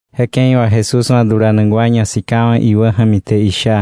Je ke̱i wà Jesús wa̱ dulanak wa ñasikawa̱ iwä ja̱mi te isha: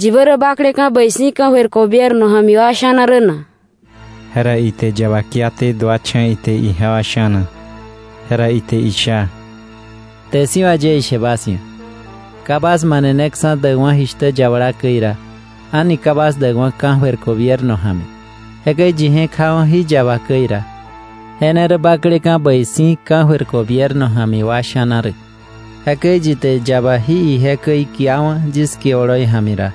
—¿Yi bä rä bakleka̱ bäi si̱ ka̱jöir gobierno ja̱mi wa sha̱na rä na? Jera ite yaba kiaté, duacha̱ ite ijewa sha̱na. Jera ite isha: —Kte si̱ wà yie ishe bas ia̱, ka bas maneneksa̱ däkwa̱ jishtä yabala käi ra, a̱ni ka bas däkwa̱ ka̱jöir gobierno ja̱mi. Jekäi yi je̱k jawa̱ jí yaba käi ra, je ne rä bakleka̱ bäi si̱ ka̱jöir gobierno ja̱mi wa sha̱na rä. Jekäi yi te yaba jí ije käi kiawa̱ yis kie oloi ja̱mi ra,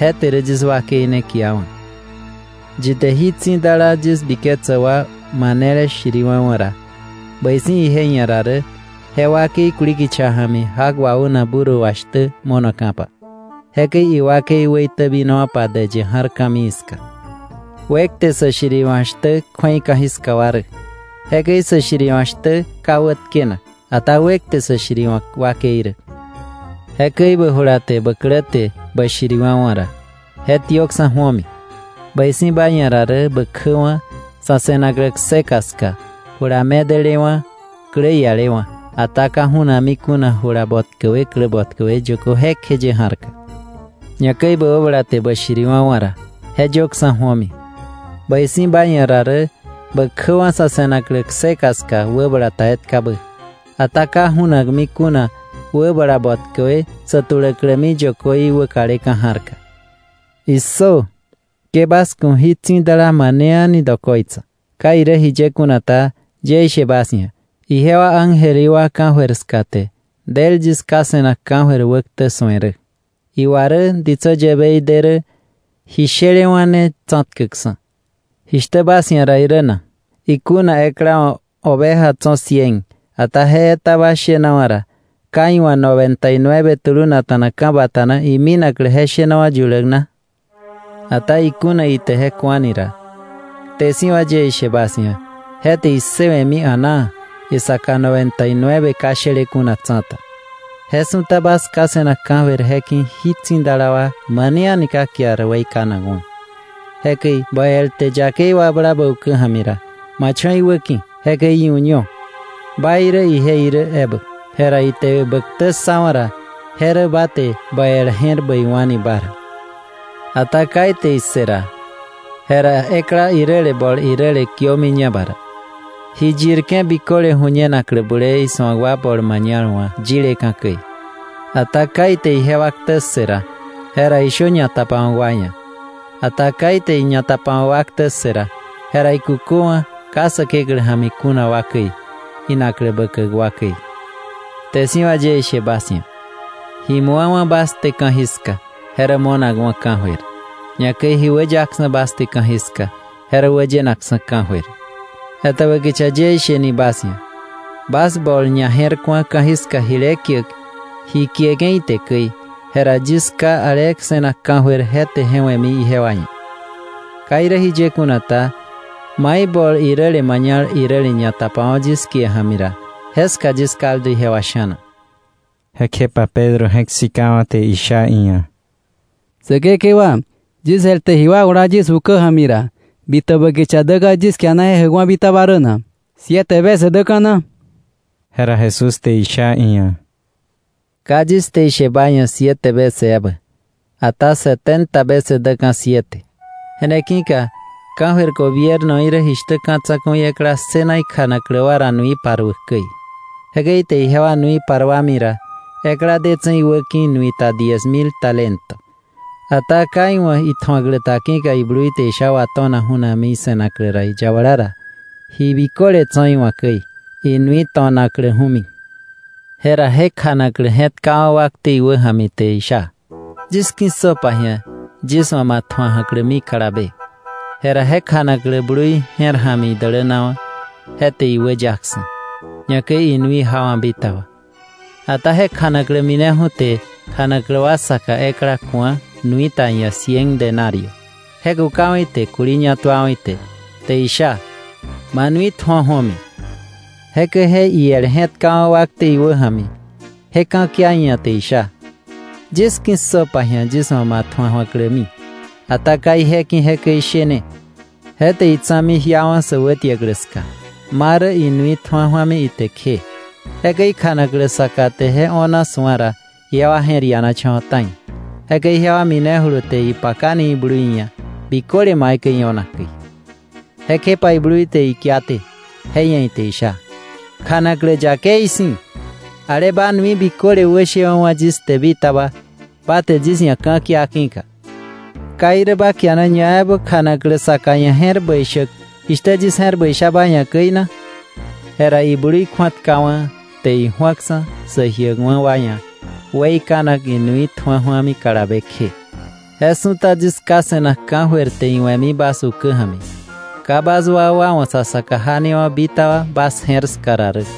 je te rä yis wakei ne kiawa̱. Yi te jí tsi̱dala yis biketsäk wa manele shiriwa̱wa̱ ra, bäi si̱ ije ia̱ ra rä je wakei kuli kicha ja̱mi jak waunak burro wa shtä mo̱noka̱pa, jekäi iwakei wäitäbinowa̱pa däyë ja̱r ka̱mii ska. ¡Wekte sä shiriwa̱k shtä kju̱ei ka̱jiska wa rä! Jekäi sä shiriwa̱k shtä ka wätkenak, ata ¡wekte sä shiriwa̱k wakei rä! Jekäi bä jula te bä klä te bä shiriwa̱wa̱ ra, je tiökksa̱ ju̱omi. Bäi si̱ ba ia̱ ra rä bä kjäwa̱ sa̱ se̱naklä kseka ska jula medelewa̱ klä ialewa̱, ata ka ju̱nakmi kuna jula botkäwe klä botkäwe yökö jekjeye ja̱rka. Ñakäi bä wäbala te bä shiriwa̱wa̱ ra, je yöksa̱ ju̱omi. Bäi si̱ ba ia̱ ra rä bä kjäwa̱ sa̱ se̱naklä kseka ska wäbala ta etkabä, ata ka ju̱nakmi kuna wäbala bötkäwe sä tuläklämi yökö í wäkaleka̱ ja̱rka. “¡Issö! Ke bas ku̱ jí tsi̱dala wa mane a̱ni dokoitsa. Ka irä jiye kuna ta, yie ishe bas ia̱, ijewa ángel í wa ka̱jöir ska te del yis Ká se̱nak ka̱jöir wäktä su̱e rä. Iwa rä ditsä yäbei de rä ji shelewa̱ ne tsa̱tkäkksa̱. “¿Jishtä bas ia̱ ra irä na? Ikuna ekla wa̱ oveja tso̱ cien, ata je etaba shenawa̱ ra, ¿ka iwa̱ noventa y nueve tulunakta̱na ka̱bata na iminaklä je shenawa̱ yuläk na? Ata ikuna ite je ku̱ani ra, kte si̱ wà yie ishe bas ia̱ je te issëwe̱mi a̱naa, isaka noventa y nueve ka shele kuna tsa̱ta. Je su̱ta bas Ká se̱nak ka̱jöir je ki̱ jí tsi̱dala wa mane a̱ni ka kiar weikanakwa̱. “Jekäi bä el te yakei wakbla bä ukä ja̱mi ra, ma cho̱ iwäki̱, jekäi iu̱ño, ba irä ije irä ebä. Jera ite bä ktä ssawa̱ ra, je rä ba te bä el je̱r bäiwa̱ni ba ra. Ata ka ite issë ra, jera ekla iräle bol iräle kiömiña ba ra, ‘ji yirke̱ biköle ju̱ñenaklä bulee isu̱ak wa bol mañal wa̱ yileka̱ käi.’ Ata ka ite ijewa ktä ssë ra, jera ishö ñatapawa̱k wa ia̱; ata ka ite ñatapawa̱k wa ktä ssë ra, jera ikuköwa̱ ka Säkeklä ja̱mi kuna wa käi, inaklä bäkäk wa käi. “Kte si̱ wà yie ishe bas ia̱, ji mu̱awa̱ bas te ka̱jiska, je rä mo̱nakwa̱ ka̱jöir. Ñakäi ji wäyaksa̱ bas te ka̱jiska, je rä wäyenakksa̱ ka̱jöir. “Etäbä kicha yie isheni bas ia̱, bas bol ñaje̱rku̱a ka̱jiska jile kiäk ji kieke̱ ite käi, jera yis Ká ale se̱nak ka̱jöir te je we̱mi ijewa ia̱. Ka irä jiye kuna ta, mai bol iräle mañal iräle ñatapawa̱ yis kie ja̱mi ra, jeska yis kaldu jewa sha̱na.” Jekjepa Pedro je̱k sikawa̱ te isha iia̱: —Säkekewa, ¿yis el te ji wakbla yis ukä ja̱mi ra bitäbä kicha däka̱ yis kiana je jäkwa̱ bitaba rä na? ¿Siete vece kjë na? Jera Jesús te isha iia̱: —Ka yis te ishe ba ia̱ siete vece ebä, ata setenta vece däka̱ siete. “Je ne ki̱ka ka̱jöir gobiernoí rä jishtä ka̱ tsa̱ku̱i ekla ssëna ikjanaklä wa ra nui paruäk käi. Jekäi ite ijewa nui paruami ra, ekla detse̱ iwäki̱ nuita diez mil talento. Ata ka iwa̱ itju̱aklä ta ki̱ka iblui te je sha wato̱nakju̱mi ise̱naklä ra, iyabala ra, ji biköle tso̱ iwa̱ käi, inui to̱nakläju̱mi. Jera je kjanaklä je̱tkawa̱ wakte iwä ja̱mi, te isha: ‘Yis ki̱ssöpa ji̱a yis wa̱ ma tju̱a ju̱aklämi kalabe.’ Jekäi je kjanaklä blui je̱r ja̱mi idälänawa̱, je te iwäyaksa̱, ñakäi inui jawa̱ bitaba. “Ata je kjanaklä mineju̱mi, te kjanaklä isaka ekla ku̱a nuita iia̱ cien denario. Je kukawa̱ ite, kuli ñatuawa̱ ite, te isha: ‘¡Ma nui tju̱o ju̱omi!’ Jekäi je iel je̱tkawa̱ wakte iwä ja̱mi, je ka̱kia iia̱ te isha: ‘Yis ki̱ssöpa ji̱a yis wa̱ ma tju̱a ju̱aklämi.’ Ata ka ije ki̱ jekäi ishene, je te itsa̱mi jiawa̱ sä wätiäklä ska, ma rä inui tju̱a ju̱ami ite kje. Jekäi kjanaklä saka te je o̱na su̱a ra, ijewa je̱r ianacha̱wa̱ ta̱i; jekäi jewa minejulu te ipakani iblui ia̱ biköle maikäi io̱na käi. Jekjepa iblui te ikiaté, je ia̱ ite isha: ‘¡Kjanaklä yakei si̱! Ale ba nui biköle wäshewa̱ wa̱ yis te bitaba, ba te yis ia̱ ka̱kia ki̱ka; ¿ka irä ba kiana ñaebä kjanaklä saka ia̱ je̱r bäi shäk, jishtä yis je̱r bäi sha ba ia̱ käi na?’ Jera iblui kju̱atkawa̱, te iju̱aksa̱ sä jiäkwa̱ wa ia̱ weikanak inui tju̱a ju̱ami ite kalabe kje.” Je su̱ta yis Ká se̱nak ka̱jöir te iwe̱mi bas ukä ja̱mi ka bas wakwa wa̱ sa saka janewa̱ bitaba bas je̱r ska ra rä.